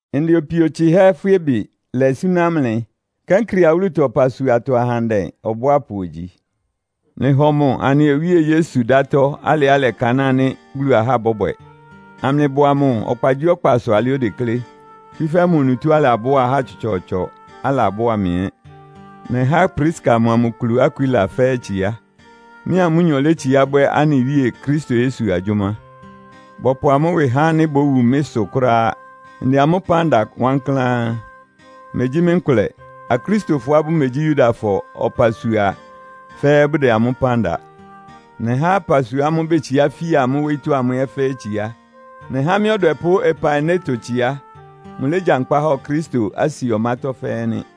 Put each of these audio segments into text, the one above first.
Ndɛ opio tsɩhɛ́ Foibe lɛ súná mlɩ. Kenkrea wúlutɔ ɔpasuatɔ ahandɛ ɔbʋápʋ ogyi. Mlɩhɔ mʋ anɩ Wíe Yesu dátɔ́ alɩá ɩlɛkanáa ánɩ́ Bulu ahá bɔ́bwɛ, amlɩbʋa mʋ ɔkpagyíɔkpasʋ alɩá odeklé. Tsúfɛ́ mʋ onutó alabʋ́a ahá tsɔtsɔɔtsɔ, alabʋ́a mɩ ɛ́. Nɛhá Priska mʋa mʋ kulu Akwila fɛ́ɛ́ tsiá. Mɩ́a amʋ́nyɔ létsiá bwɛ́ anɩ Wíe Kristo Yesu agyʋ́má. Bɔpʋ amʋ́ ɩwɩ há ánɩ́ bówu mɩ́ sʋ kʋ́ráá. Ndɛ amʋ́ ɩpán da wankláán. Megyí mɩ́ nkʋlɛ. Akristofɔá bʋmegyí Yudafɔ ɔpasua fɛ́ɛ́ bʋdɛ amʋ́ ɩpán da. Nɛhá ɔpasua ámʋ́ʋ́ betsiá fia amʋ́ wóyítɔ́ ámʋ ɛ́ fɛ́ɛ́ tsiá. Nɛhá mɩ́ ɔdwɛpʋ́ Epaineto tsiá. Mʋlégyankpá hɔ Kristo Asia ɔmátɔ́ fɛ́ɛ́ nɩ́.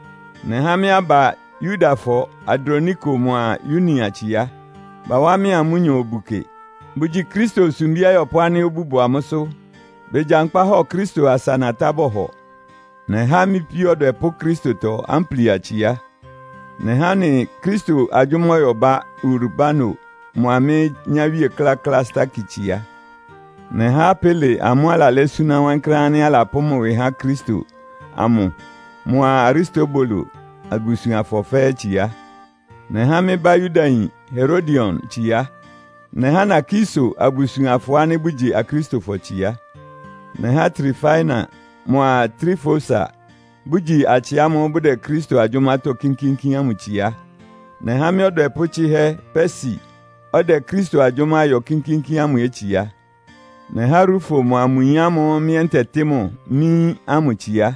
Nɛhá mɩ́ aba Yudafɔ Androniko mʋa Yunia tsiá. Bawá mɩ́a amʋ́nyɔ obu kɩ. Bʋgyi Kristo sumbí ayɔpʋ́ ánɩ́ obú bʋ amʋ́sʋ́. Begyankpá hɔ Kristo asa natá bɔhɔ. Nɛhá mɩ́ píó ɔdwɛpʋ́ Kristotɔ Amplia tsiá. Nɛhá anɩ Kristo agyʋ́má ɔyɔbá Urbano mʋa mɩ́ nyáwíe kláklá Staki tsiá. Nɛhá Apele amʋ́ʋ́ alalɛ́ súná wankláán ánɩ́ alapʋ́ mʋ ɩwɩ há Kristo amʋ mʋa Aristobulo abusuanfɔ fɛ́ɛ́ tsiá. Nɛhá mɩ́ bá Yudayin Herodion tsiá. Nɛhá Narkiso abusuanfɔ ánɩ́ bʋgyi Akristofɔ tsiá. Nɛhá Trifaina mʋa Trifosa, bʋgyi atsɩ ámʋ́ʋ́ bʋdɛ Kristo agyʋ́mátɔ́ kínkíínkín ámʋ tsiá. Nɛhá mɩ́ ɔdwɛpʋ́ tsɩ́hɛ́ Persi, ɔdɛ Kristo agyʋ́má yɔ kínkíínkín ámʋ ɛ́ tsiá. Nɛhá Rufo mʋa mʋ yin ámʋ́ʋ́ mɩ́ ɛ́ ntɛtɩ́ mʋ mɩ́ yín ámʋ tsiá.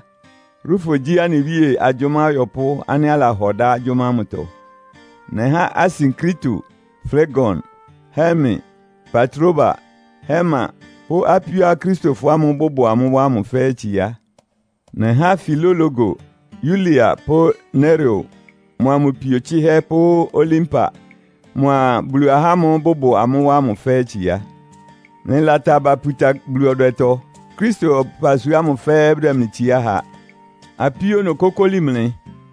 Rufo gyí anɩ Wíe agyʋ́má ɔyɔpʋ́ ánɩ́ alahɔ dá agyʋ́má ámʋtɔ. Nɛhá Asinkrito, Flegon, Herme, Patroba, Herma pʋ́ apíó Akristofɔ ámʋ́ʋ́ bʋbʋ amʋ́ wá ámʋ fɛ́ɛ́ tsiá. Nɛhá Filologo, Yulia pʋ́ Nereo mʋa mʋ pio tsɩ́hɛ́ pʋ́ Olimpa mʋa Bulu ahá ámʋ́ʋ́ bʋbʋ amʋ́ wá ámʋ fɛ́ɛ́ tsiá. Mlɩlata aba puta Bulu ɔdwɛtɔ. Kristo ɔpasua ámʋ fɛ́ɛ́ bʋdɛ mlɩ tsiá ha. Apíó, nokókóli mlɩ,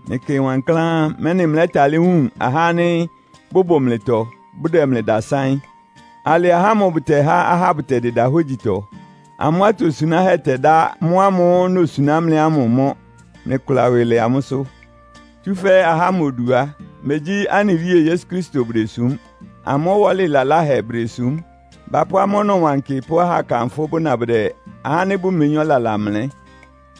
mlɩkɩ wankláán, mɛ́nɩ mlɛ́talɩ́ wun ahá ánɩ́ bʋbʋ mlɩtɔ, bʋdɛ mlɩ dasáɩ́n. Alɩ ahá ámʋ bʋtɛhá ahá bʋtɛdɩda hógyitɔ. Amʋ́ atosunáhɛ́ tɛdá mʋ́ ámʋ́ʋ́ nosuná mlɩ ámʋ mɔ́. Mlɩkʋla ɩwɩ lɛ amʋ́sʋ́. Tsúfɛ́ ahá ámʋ odu á, megyí anɩ Wíe Yesu Kristo bʋdesúm. Amʋ́ ɔwɔ́lɩ laláhɛ bʋdesúm. Bapʋ́ amʋ́ ɔnɔwankɩ pʋ́ ahákanfʋ́ bʋna bʋdɛ ahá ánɩ́ bʋmeyín ɔlala mlɛ́.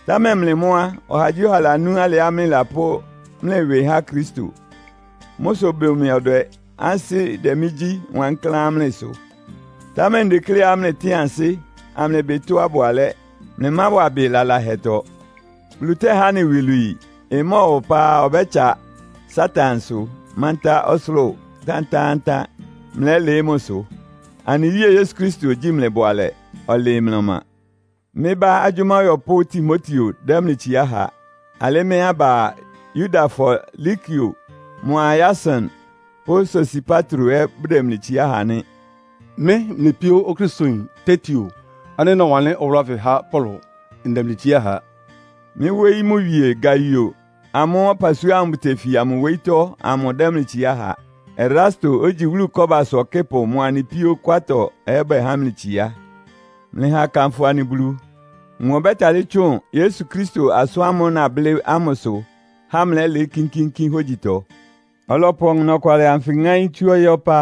Támɛ mlɩ mʋ́ á, ɔhagyíɔha lanú alɩá mlɩlapʋ́ mlɩ ɩwɩ há Kristo. Mʋ́ sʋ ɩbʋ mɩ ɔdwɛ, ansɩ́ dɛ mɩ́ gyi wankláán mlɩ sʋ. Támɛ ndekléá mlɩtɩ́ɩn ansɩ́, amlɩbɩ tɔ́á ɩbʋ alɛ́. Mlɩmáwa ɩbɩ lalahɛtɔ. Bulu tɛ́há anɩ iwilwii. Ɩmɔ́ɔwa ɔpá á, ɔbɛ́tsa Satansʋ mántá ɔsʋlʋ́ʋ tántáántán, mlɛ́lɩɩ́ mʋsʋ. Anɩ Wíe Yesu Kristo ogyíi mlɩ bʋalɛ, ɔlɩɩ mlɩ ɔma. Mɩ́ bá agyʋ́má ɔyɔpʋ́ Timoteo dɛ́ mlɩ tsiá ha. Alɩ́ mɩ́ aba Yudafɔ Lukio mʋa Yason pʋ́ Sosipatro ɛ́ bʋdɛ mlɩ tsiá ha nɩ́. Mɩ́ mlɩ píó Okristoyin Tertio ánɩ́ nɔwanlɩ́n ɔwʋlʋ́ ánfɩ há Paulo, ndɛ mlɩ tsiá ha. Mɩ́ wóyí mʋ wie Gaio amʋ́ʋ́ ɔpasua ámʋ́ʋ́ bʋtefia mʋ wóyítɔ́ amʋ dɛ́ mlɩ tsiá ha. Erasto, ogyi wúlu kɔ́basʋ ɔkɩ́pʋ mʋa anɩ píó Kwartɔ ɛ́ bɛhá mlɩ tsiá. Mlɩha akanfʋ anɩ Bulu! Mʋ ɔbɛ́talɩ́ tsʋn Yesu Kristo asʋ́n amʋ́ʋ́ nablɩ́ ámʋsʋ há mlɛ́lɩɩ́ kínkíínkín hógyitɔ. Ɔlɔpʋ ɔnɔkwalɩ anfɩ ŋáín tsú ɔyɩ́ ɔpá.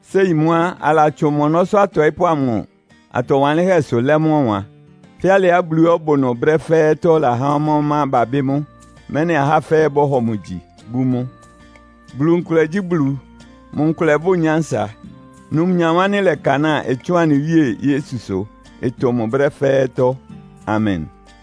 Séi mʋ́ á, alatsʋn mʋ ɔnɔ́sʋ́ atɔɩ́pʋ́ amʋ atɔ wanlɩ́nhɛ́sʋ lɛ́ mʋ́ ɔwan. Fɛ́ alɩá Buluá ɔbʋ ɩnʋ brɛ́ fɛ́ɛ́tɔ́ lahá ɔmá-ɔmá babɩ́ mʋ́, mɛ́nɩ ahá fɛ́ɛ́ bɔ́hɔ mʋ gyi, bú mʋ. Bulu nkʋlɛ gyí Bulu. Mʋ nkʋlɛ bʋ́ʋ nyánsa. Numnyam ánɩ́ ɩlɛkanáa ɩtsʋ́ʋn anɩ Wíe Yesusʋ ɩtʋ mʋ brɛ́ fɛ́ɛ́tɔ́. Amen!